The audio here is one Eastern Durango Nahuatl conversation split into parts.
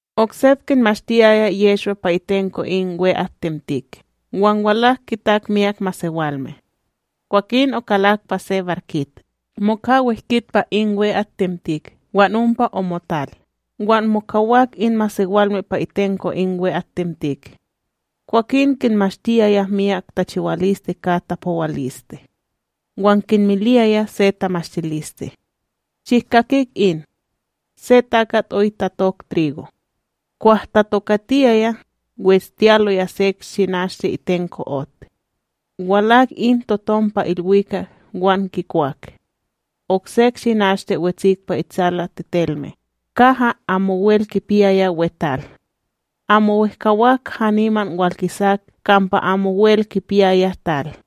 Oksep kinmashtiyaya Yehshwa pa itenko in we'atTemtik, wan walak kitak myak masewalme. Kwakin okalak pa se barkit moka wehkit pa in we'atTemtik wan ompa omotal, wan mokawak in masewalme pa itenko in we'atTemtik. Kwakin kinmashtiyaya myak tachiwaliste ka tapowaliste; wan kinmiliyaya se tamashtiliste: ―Shihkakik in: Se takat oy tatok trigo. Kwah tatokatiyaya, westiyaloya sek shinashte itenko ot; walak in totom pa ilwikak wan kikwak. Oksek shinashte wetsik pa itsalaTetelme, kaha amowel kipiyaya we tal; amo wehkawak haniman walkisak kampa amowel kipiyaya tal.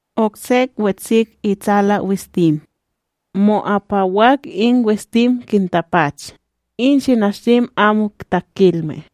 Oksek wetsik tsalaWistim; mo'apawak in wistim kintapach, in shinashtim amo takilme.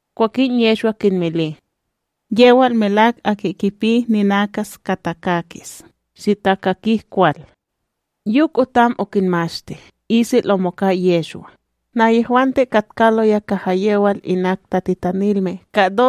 Kwakin Yehshwa kinmili: ―Yewal melak aki kipi ninakas ka takakis, shitakakik kwal. Yok otam okinmashti, isel omoka Yehshwa, nahyehwante katkaloya kaha yewal inak tatitanilme ka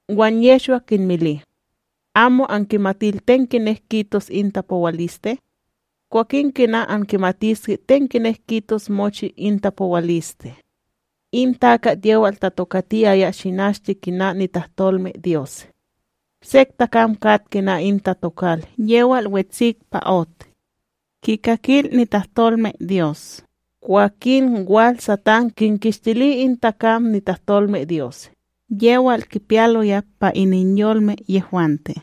Wan Yehshwa kinmili: ―Amo ankimatil ten kinek kitos in tapowaliste? Kwakin kina ankimatiske ten kinek kitos mochi in tapowaliste? In takat yewal tatokatiyaya shinashte kina nitahtolmeDyos. Sek takam kat kina in tatokal yewal wetsik pa ot: kikakil nitahtolmeDyos, kwakin wal Satán kinkishtili in takam nitahtolmeDyos yewal kipiyaloya pa ininyolme yehwante.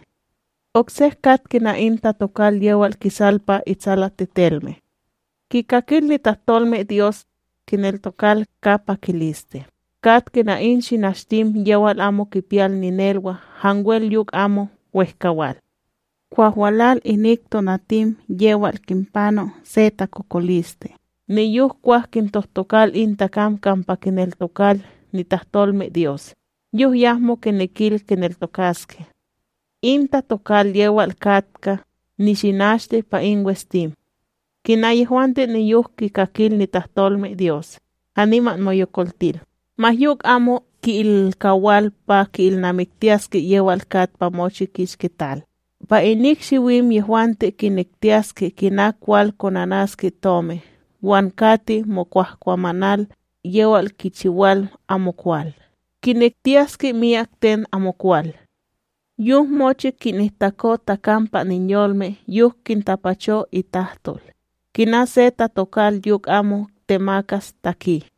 Oksek kat kina in tatokal yewal kisal pa itsalaTetelme: kikakil nitahtolmeDyos kineltokal ka pakiliste, kat kina in shinashtim yewal amo kipiyal ninelwa hanwel yok amo wehkawal; kwah walal inik tonatim yewal kinpano se takokoliste niyok kwah kintohtokal in takam kampa kineltokal nitahtolmeDyos, yok yahmo kinekil kineltokaske. In tatokal yewal katka nishinashte pa in wistim: kina yehwante niyok kikakil nitahtolmeDyos, haniman moyokoltil, ma yok amo ki'ilkawal pa ki'ilnamiktiyaske yewal kat pa mochi kishki tal, pa inik shiwim yehwante kinektiyaske kina kwal konanaske tomi wan kati mokwahkwamanal yewal kichiwal amokwal, kinektiyaske myak ten amokwal. Yok mochi kinihtako takam pa ininyolme yok kitapacho itahtol, kina se tatokal yok amo temakas taki.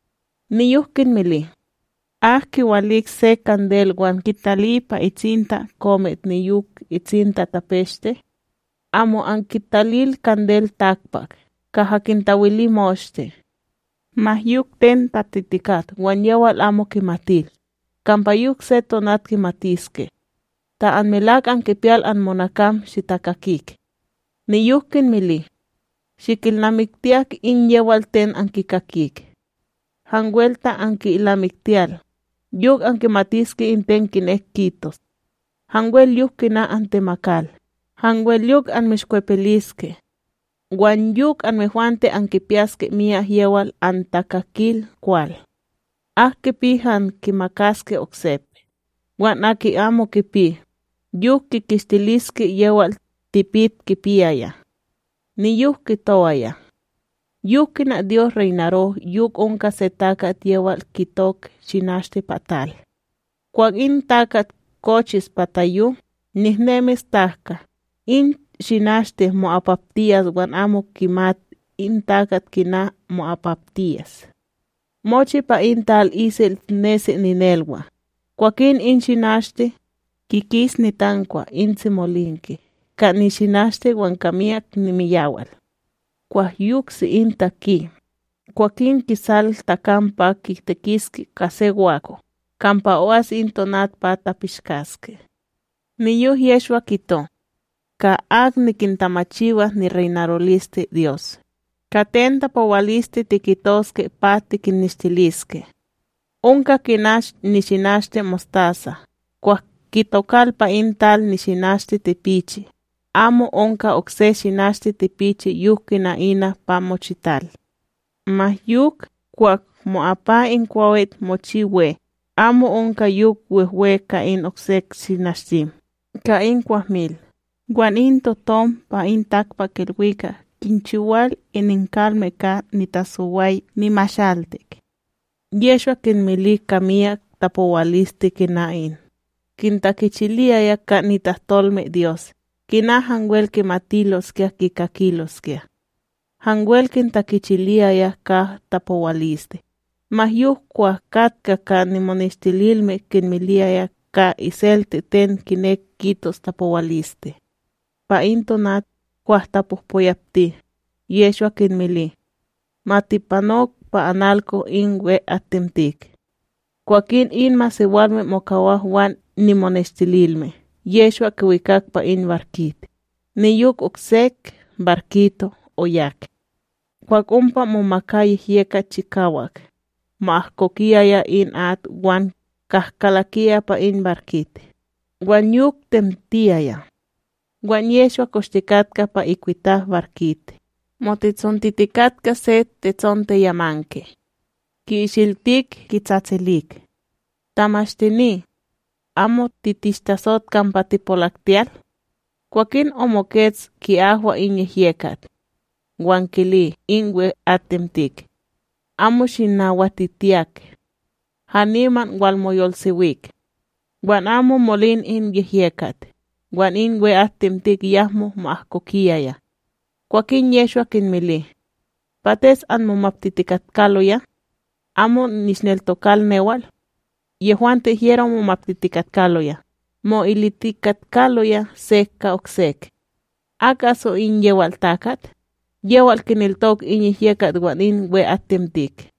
Niyok kinmili: ―Ak kiwalik se kandel wan kitali pa itsinta komit niyok itsinta tapeshte? Amo, ankitalil kandel takpak, kaha kintawili moshte. Ma yok ten tatitikat wan yewal amo kimatil, kampa yok se tonat kimatiske. Ta anmelak ankipiyal anmonakam, shitakakik. Niyok kinmili: ―Shikilnamiktiyak in yewal ten ankikakik. Hanwel ta anki'ilnamiktiyal, yok ankimatiske in ten kinek kitos. Hanwel yok kina antemakal, hanwel yok anmishkwepiliske. Wan yok anmehwante ankipiyaske miyak yewal antakakil kwal. Ak kipi han, kimakaske oksep, wan aki amo kipi, yok kikishtiliske yewal tipit kipiyaya. Niyok kitowaya: ―Yok kina Dyos reynaro yok onka se takat yewal kitok shinashte pa tal; kwah in takat kochis pa tayo, nehnemis tahka, in shinashte mo'apaptiyas wan amo kimat in takat kina mo'apaptiyas. Mochi pa in tal isel nesi ninelwa; kwakin in shinashte, kikis nitankwa in tsimolinke ka nishinashte wan ka miyak nimiyawal; kwah yoksi in taki, kwakin kisal takam pa kitekiske ka se wako, kampa o'as in tonat pa tapishkaske. Niyok Yehshwa kito: ―Ka ak nikintamachiwas nireynarolisteDyos, ka ten tapowaliste tikitoske pa tikinnishtiliske? Onka kina nishinashte mostasa kwah kitokal pa in tal shinashte tipichi, amo onka okse shinashte tipichi yok kina ina pa mochital; ma yok, kwah mo'apa in kwawit mochi we amo onka yok wehwe ka in oksek shinashtim ka in kwahmil, wan in totom pa in takpakIlwikak kinchiwal ininkalme ka nitasoway nimashaltik. Yehshwa kinmili ka myak tapowaliste kina in, kintakichiliyaya ka nitahtolmeDyos kina hanwel kimatiloskya kikakiloskya. Hanwel kintakichiliyaya ka tapowaliste, ma yok kwah katka ka nimoneshtililme kinmiliyaya ka iselte ten kinek kitos tapowaliste. Pa in tonat, kwah tapohpoyapti, Yehshwa kinmili: ―Ma tipanok pa analko in we'atTemtik. Kwakin in masewalme mokawak wan nimoneshtililme Yehshwa kiwikak pa in barkit, niyok oksek barkito' oyak. Kwah ompa momaka yehyekat chikawak, mo'ahkokiyaya in at wan kahkalakiyaya pa in barkit, wan yok temtiyaya. Wan Yehshwa koshtikatka pa ikwitap barkit motitsontitikatka se tetsonteyamanke; ki'ishiltik kitsatsilik: ―Tamashtini! Amo titishtatsot kampa tipolaktiyal? Kwakin omokets oki'ahwa in yehyekat; wan kili in we'atTemtik: ―Amo shinawatitiyak! Haniman walmoyolsewik! Wan amo molin in yehyekat, wan in we'atTemtik yahmo mo'ahkokiyaya. Kwakin Yehshwa kinmili: ―Pates anmomaptitikatkaloya? Amo nishneltokal newal? Yehwante hyero momaptitikatkaloya, mo'ilitikatkaloya sek ka oksek: ―Ak aso in yewal takat, yewal kineltokal in yehyekat wan in we'atTemtik?